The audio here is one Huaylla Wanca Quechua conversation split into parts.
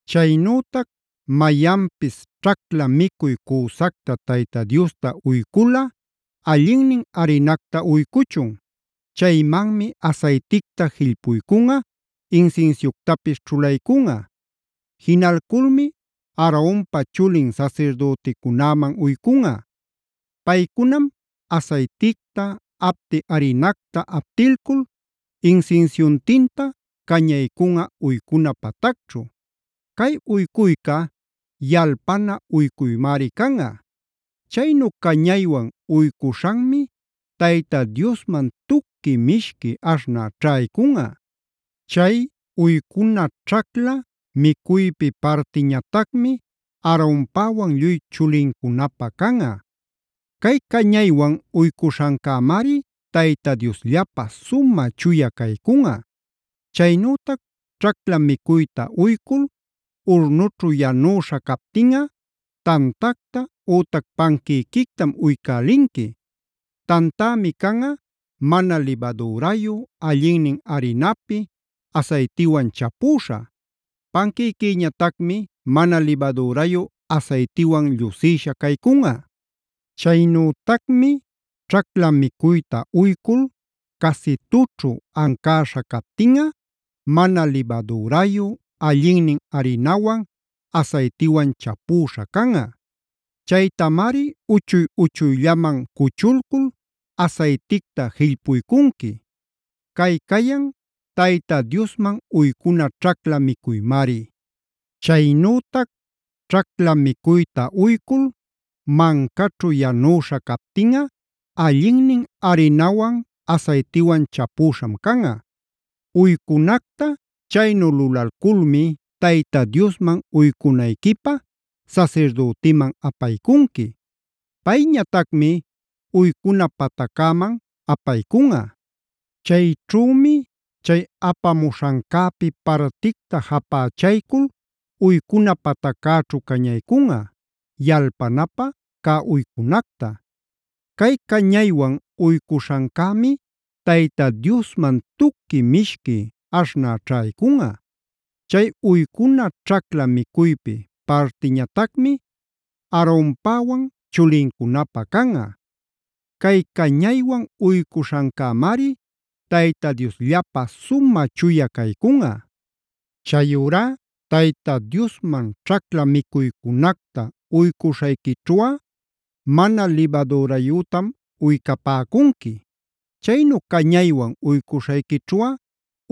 Chaynütac mayanpis ćhacla micuy cüsacta Tayta Diosta uyculꞌa allinnin arinacta uycuchun. Chaymanmi asayticta jillpuycunꞌa, insinsiuctapis ćhulaycunꞌa. Jinalculmi Aaronpa chulin sasirdüticunäman uycunꞌa. Paycunam asayticta, apti arinacta aptilcul insinsiuntinta cañaycunꞌa uycuna patacćhu. Cay uycuyca yalpana uycuymari canꞌa. Chaynu cañaywan uycuśhanmi Tayta Diosman tuqui mishqui aśhnä ćhaycunꞌa. Chay uycuna ćhacla micuypi partiñatacmi Aaronpäwan lluy chulincunapä canꞌa. Cay cañaywan uycuśhancämari Tayta Diosllapä sumä chuya caycunꞌa. Chaynütac ćhacla micuyta uycul, urnućhu yanüśha captinꞌa tantacta ütac panquïquictam uycälinqui. Tantämi canꞌa mana libadürayu, allinnin arinapi, asaytiwan chapüśha. Panquïquïñatacmi mana libadürayu asaytiwan llusïsha caycunꞌa. Chaynütacmi ćhacla micuyta uycul, casitućhu ancäśha captinꞌa mana libadürayu, allinnin arinawan, asaytiwan chapüśha canꞌa. Chaytamari uchuy uchuyllaman cuchulcul asayticta jillpuycunqui. Cay cayan Tayta Diosman uycuna ćhacla micuymari. Chaynütac ćhacla micuyta uycul, mancaćhu yanüśha captinꞌa allinnin arinawan, asaytiwan chapüśham canꞌa. Uycunacta chaynu lulalculmi Tayta Diosman uycunayquipä sasirdütiman apaycunqui. Payñatacmi uycuna pataccäman apaycunꞌa. Chayćhümi chay apamuśhancäpi particta japächaycul uycuna pataccäćhu cañaycunꞌa yalpanapä cä uycunacta. Cay cañaywan uycuśhancämi Tayta Diosman tuqui mishqui aśhnä ćhaycunꞌa. Chay uycuna ćhacla micuypi partiñatacmi Aaronpäwan chulincunapä canꞌa. Cay cañaywan uycuśhancämari Tayta Diosllapä sumä chuya caycunꞌa. Chayurá Tayta Diosman ćhacla micuycunacta uycuśhayquićhuꞌa mana libadürayütam uycapäcunqui. Chaynu cañaywan uycuśhayquićhuꞌa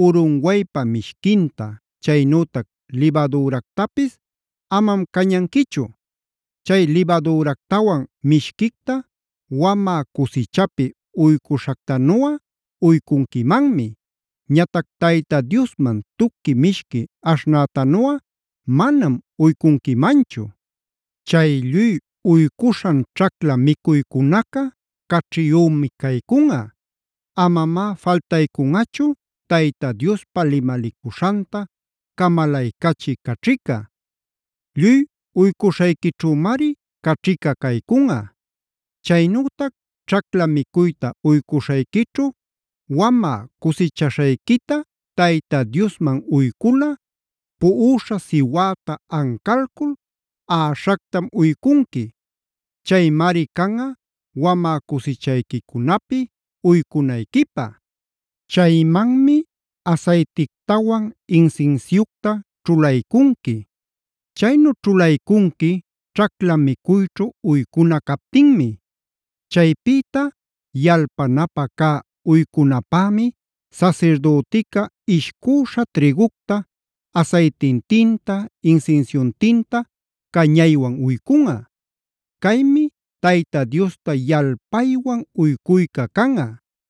urunwaypa mishquinta, chaynütac libadüractapis amam cañanquichu. Chay libadüractawan mishquicta wamä cusichapi uycuśhactanuꞌa uycunquimanmi. Ñatac Tayta Diosman tuqui mishqui aśhnätanuꞌa manam uycunquimanchu. Chay lluy uycuśhan ćhacla micuycunaca caćhiyümi caycunꞌa.a Amamá faltaycunꞌachu Tayta Diospa limalicuśhanta camalaycachï caćhica. Lluy uycuśhayquićhümari caćhica caycunꞌa. Chaynütac ćhacla micuyta uycuśhayquićhu wamä cusichaśhayquita Tayta Diosman uyculꞌa puꞌuśha siwäta ancalcul aꞌaśhactam uycunqui. Chaymari canꞌa wamä cusichayquicunapi uycunayquipä. Chaymanmi asaytictawan, insinsiucta ćhulaycunqui. Chaynu ćhulaycunqui ćhacla micuyćhu uycuna captinmi. Chaypïta yalpanapä cä uycunapämi sasirdütica ishcüśha trïgucta asaytintinta, insinsiuntinta cañaywan uycunꞌa. Caymi Tayta Diosta yalpaywan uycuyca canꞌa.